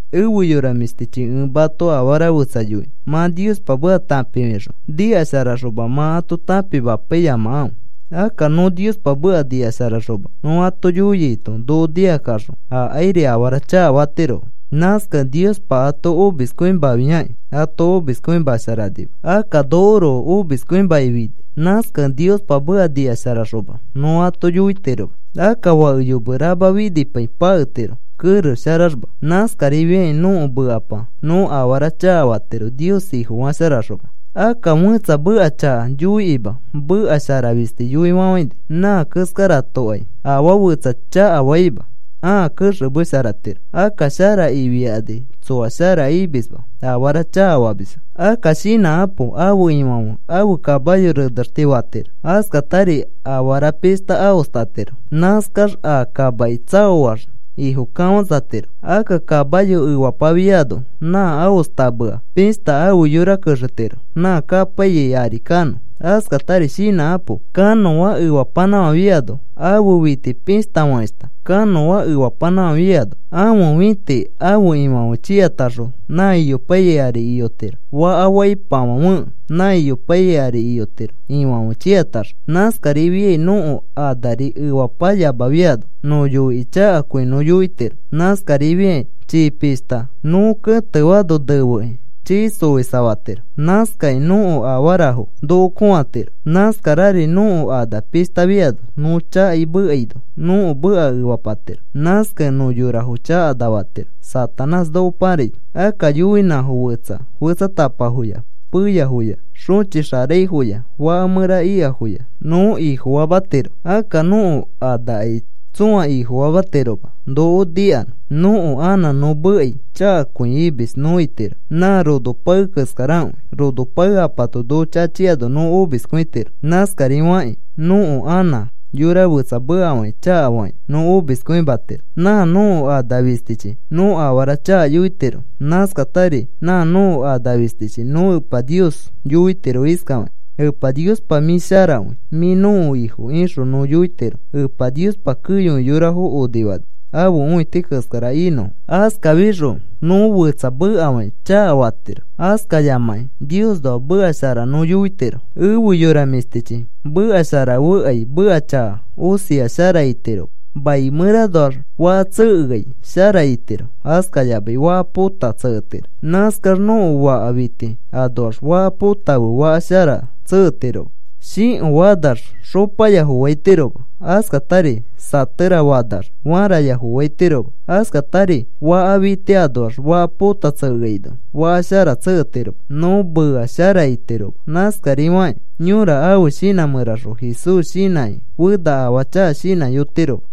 Efe yora mĩshtichi, ẽ mato afara fetsa yoinõ. Mã Niospa meka tãpifixõ nikasharaxoma mã ato tãpimapaiyamakãfe. Akka nõ Niospa meka nikasharaxoma nõ ato yoiaito noko nikakaxõ akairi afara chakafatirofo. Nãskakẽ Niospa ato omiskõimafiakĩ, ato omiskõimasharanima. Akka nokoroko omiskõimakĩ finai. Nãskakẽ Niospa meka nikasharaxoma nõ ato yoitiroma. Akka fake yome rama finipai paketiro kerex sharaxma. Nãskarifiakĩ nõko mekapa nõ afara chakafatiro, Nios Ifofasharaxoma. Akka fẽtsa meka chaka yoikĩma meka shara fisti yoifafãini nã keskaratokai afaa fetsa chakafaima ãa kexemesharatiro. Akka shara ifiakani tsoa shara imisma, afara chakafamisfo. Akka shinãkapo. Ãfe ifãfe ãfe kamayo renexti fatiro. Askatari afara pishta aostatiro. Nãskax a kamaki tsaoax ifo kafãsatiro. Akka kamayo efapafiano nã aostamea pishta ãfe yora kexetiro nã kapaiyai ari kanõ. Askatari shinãkapo. Kanõa efapanãfãfiano ãfe fiti pishtafakeshta. Kanõa efapanãfãfiano ãfe fĩti ãfe ifãfe chiataxõ nã iyopaiyai ari iyotiro. Faka faipafãfekẽ, nã iyopaiyai ari iyotiro ifãfe chiataxõ. Nãskarifiai nõko anari efapayamafiano nõ yoikĩ chakakõi nõ yoitiro. Nãskarifiakĩ chii pishta nõ kẽtefaano nefekĩ chii xoisafatiro. Nãskakĩ nõko afarafo noko kõatiro. Nãskarari nõko ana pishtafiano, nõ chakai mekaino, nõko meka efapatiro. Nãskakẽ nõ yorafo chakana fatiro Satanás noko pãraino. Akka yoinãfo fetsa fetsatapafoya, peyafoya, xõchixaraifori, faka mẽra ikafoya nõ ifofamatiro. Akka nõko anakai tsõa ifofamatiroma noko nikanõ. Nõko anã nõ mekai chakakõi imis nõ itiro. Nã rono pae keskarakõi. Rono paekapato noko chachiano nõ omiskõitiro. Nãskarifakĩ nõko anã yora fetsa mekafakĩ, chakafakĩ, nõ omiskõimatiro. Nã nõko ana fistichi nõ afara chaka yoitiro. Nãskatari nã nõko ana fistichi nõ Epa Nios yoitiro iskafakĩ: “Epa Niospa, mĩ sharakõi. Mĩ nõko Ifo,” ixõ nõ yoitiro. Epa Niospa keyokõi yorafo onifani ãfe õiti keskara inõfo. Askafixõ nõ fetsa mekafakĩ chakafatiro, askafayamakĩ Niosnoa meka shara nõ yoitiro. Efe yora mĩshtichi, meka sharafekai meka chaka osia shara itiroma. Mai mẽranoax faka tsekeai shara itiro, askayamai faka pota tseketiro. Nãskax nõko faka fiti anoax faka pota fe faka shara tseketiroma. Shĩko fanax xopaya foaitiroma. Askatari sãtera fanax fãraya foaitiroma. Askatari faka fiti anoax faka pota tsekeaino, faka shara tseketiroma, nõ mea shara itiroma. Nãskarifakĩ yõra ãfe shinã mẽraxõ Jesús shinãkĩ fena afaa chaka shinãyotiroma.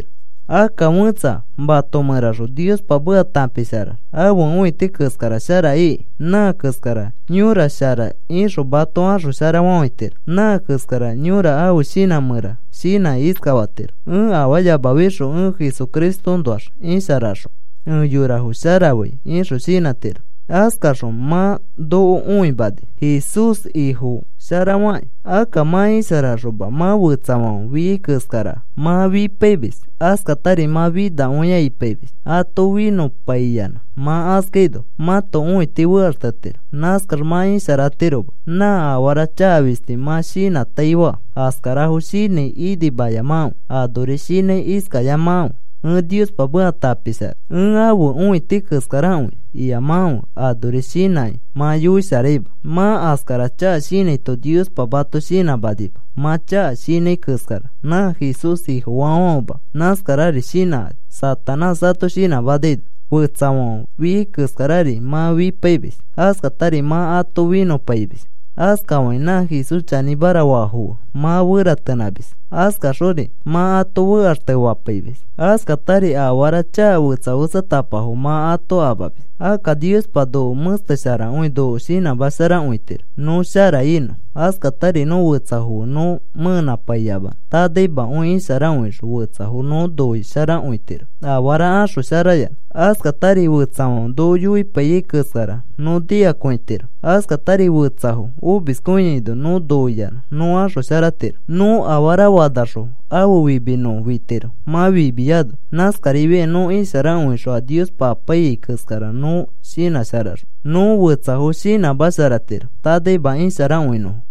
Akka fẽtsa mato mẽraxõ Niospa meka tãpisharax ãfe õiti keskara shara ikĩ, nã keskara yõra shara ixõ mato axosharafafãitiro. Nã keskara yõra ãfe shinã mẽra shinãkĩ iskafatiro: “Ẽ afaayamafixõ ẽ Jesucristoõnoax isharaxõ, ẽ yorafo sharafai,” ixõ shinãtiro. Askaxõ mã noko õimani Jesús Ifosharafakĩ. Akka mã isharaxoma, mã fetsafãfe fiai keskara mã fipaimis, askatari mã finakõia ipaimis, ato finõpaiyanã mã askaino mãto õiti fekaxtetiro. Nãskax mã isharatiroma. Nã afara chaka fisti mã shinãtaifa, askarafo shinãi, inimayamakãfe. Anori shinãi iskayamakãfe: “Ẽ Niospa meka tãpishara, ẽ ãfe õiti keskarakõi,” iyamakãfe. Anori shinãkĩ mã yoisharaima. Mã askara chaka shinãito Niospa mato shinãmanima. Mã chaka shinãi keskara nã Jesús Ifofaafãfema nãskarari shinãkani, Satanás ato shinãmanaino. Fetsafãfe fiai keskarari mã fipaimis, askatari mã ato finõpaimis, askafakĩ nã Jesús chanĩmara faafo fe mã feratenãmis. Askaxori mã ato fekaxtefapaimis. Askatari afara chaka fetsa fetsatapafo mã ato amamis. Akka Niospa noko mẽstesharakõi noko shinãmasharakõitiro. Nõ shara inõ, askatari nõ fetsafo fe nõ mẽnãpaiyamanõ, tanaimakõi isharakõixõ fetsafo nõ noisharakõitiro afara axosharayanã, askatari fetsafãfe noko yoipaiyai keskara nõ nikakõitiro, askatari fetsafo omiskõiaino nõ noiyanã nõ axosharatiro. Nõ afara fanaxõ, ãfe fimi nõ fitiro mã fimiyano. Nãskarifiakĩ nõ isharakõixõ a Niospa apaiyai keskara nõ shinãsharaxõ, nõ fetsafo shinãmasharatiro, tanaima isharakõinõfo.